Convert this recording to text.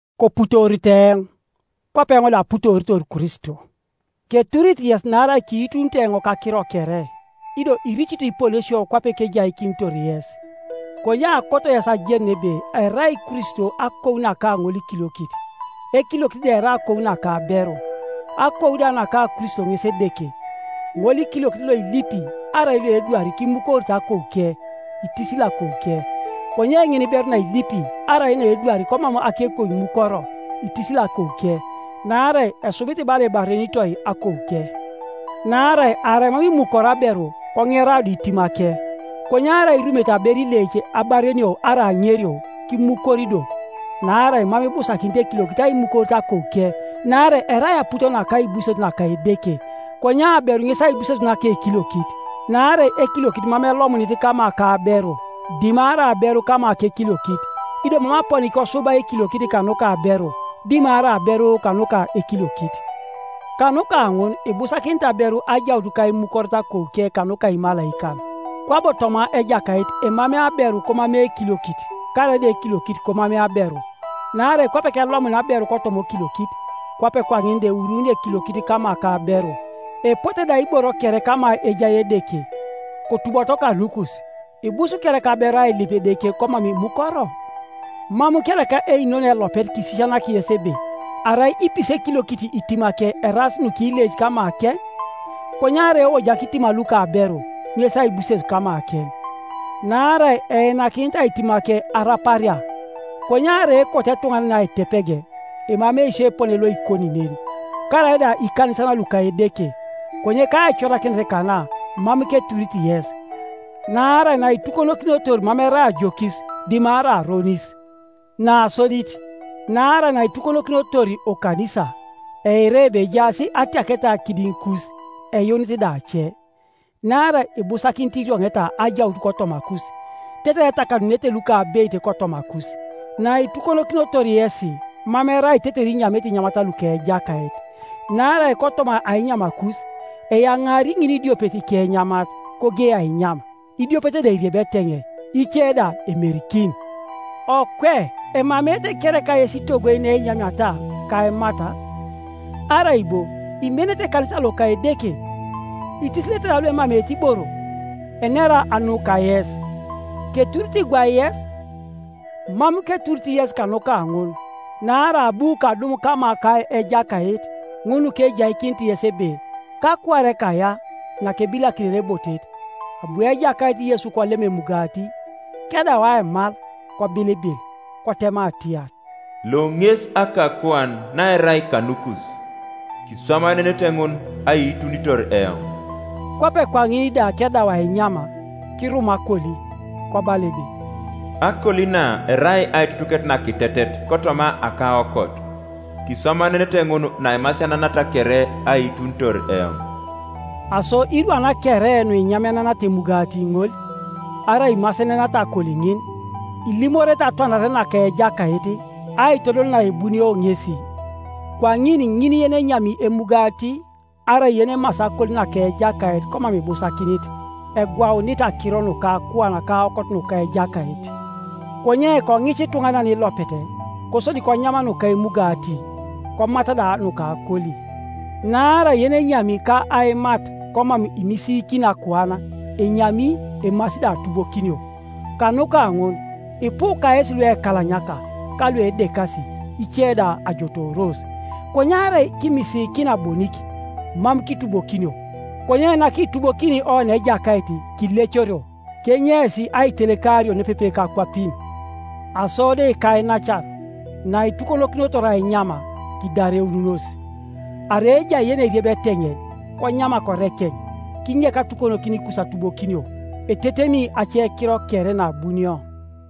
Koputoorito eoŋ, kwape eoŋ da aputoritor Kristo. Keturit yes naarai kiitunito eoŋ kakiro kere, ido iricito iponesio kwape kejaikinitor yes. Konye akoto yes ajenun ebe erai Kristo akou naka ŋolikiliokit, ekiliokit da erai akou naka aberu, akou da naka Kristo ŋes Edeke. Ŋolikiliokit loilipi arai loedwari kimukorite akouke, itisili akouke, Konye ŋiniberu nailipi arai naedwari komam akekou imukoro, itisili akouke. Naarai esubit bala ebarenitoi akouke. Naarai arai mam imukoro aberu, koŋera do itimake, Konye arai irumete aberu ileic abarenio arai aŋerio, kimukori do. Naarai mam ibusakinit ekiliokit aimukorit akouke, naarai erai aput ka aibuses naka Edeke; konye aberu ŋes aibuses naka ekiliokit. Naarai ekiliokit mam elomunit kama ka aberu, dimarai aberu kama kekiliokit. Ido mam aponi kosubai ekiliokit kanuka aberu, dimarai aberu kanuka ekiliokit. Kanuka ŋun ibusakinit aberu ajaut kaimukoret akouke kanuka imalaikan. Kwabo toma Ejakait emamei aberu komamei ekiliokit, karaida ekiliokit komamei aberu. Naarai kwape kelomunia aberu kotoma okiliokit, kwape kwaŋin da euruunio ekiliokit kama ka aberu. Epote da iboro kere kama ejai Edeke. Kotuboto kanukus; ibus kereka aberu ailip Edeke komam imukoro? Mam kereka einono elopet kisisianak yes ebe, arai ipisi ekiliokit itimake eraas nukileic kamakeŋ? Konye arai eojak itima luka aberu, ŋes aibuses kamakeŋ? Naarai einakinitai itimake araparia. Konye arai ekot ituŋanan aitepeg, emamei sio epone loikoni nen, karaida ikanisan luka Edeke. Konye kaicorakinet kana mam keturit yes, naarai naitukonokinotor mam erai ajokis, dimarai aronis. Nasodit, naarai naitukonokinotor okanisa, eira ebe ejaas atiaketa kidiŋikus, eyuunit da ace. Naarai ibusakinit irioŋeta ajaut kotomakus, tetere etakanunete lukabeit kotomakus. Naitukonokinotor yesi mam erai tetere inyamete inyamat luka Ejakait, Naarai kotoma ainyamakus, eyaŋaari ŋinidiopet ikenyamat, kogei ainyam, idiopet da eriebi eteŋei, ice da emerikin. Okwe emameete kereka yes itogoi neinyamiata, ka aimat? Arai bo imenete ekanisa loka Edeke, itisilete da luemameete iboro? Enera anu kayes? Keturit gwai yes? Mam keturit yes kanuka ŋun. Naarai abu kadum kama ka Ejakait, ŋun nukejaikinit yes ebe, kakuare kaya nakebilakinere ebotet, abu Ejakait Yesu kolem emugati, kedau aimal, kobilibil; kotema atiar, “Lo ŋes akakuan naerai kanukus. Kiswamaenenete ŋun aiitunitor eoŋ.” Kwape kwaŋin da kedaut ainyam, kirum akoli, kobala ebe, “Akoli na erai aitutuket nakitetet kotoma akaokot. Kiswamaenenete ŋun naimasiananata kere, aiitunitor eoŋ.” Aso irwan kere nuinyamenenata emugati ŋol, arai imasenenata akoli ŋin, ilimorete atwanare naka Ejakait, aitodol naebunio ŋesi. Kwaŋin ŋin yenenyami emugati arai yenemasi akoli naka Ejakait komam ibusakinit, egwaunit akiro nuka akuan ka aokot nuka Ejakait. Konye koŋica ituŋanan ilopet, kosodi konyam nuka emugati, komat da nuka akoli. Naarai yenenyami ka aimat komam imisiikini akuan, enyami emasi da atubokinio. Kanuka ŋun ipu kayesi luekalanyaka, ka luedekasi, ice da ajotooros. Konye arai kimisiikina bonik, mam kitubokinio. Konye nakitubokini oni Ejakait, kilecorio, kenyeis aitelekario nepepe kakwapin. Aso do ikainacan, naitukonokinotor ainyam, kidareununos, arai ejai yeneriebi eteŋei, konyam korekeŋ; kinyek atukonokinikus atubokinio. Etetemi acekiro kere naabunio.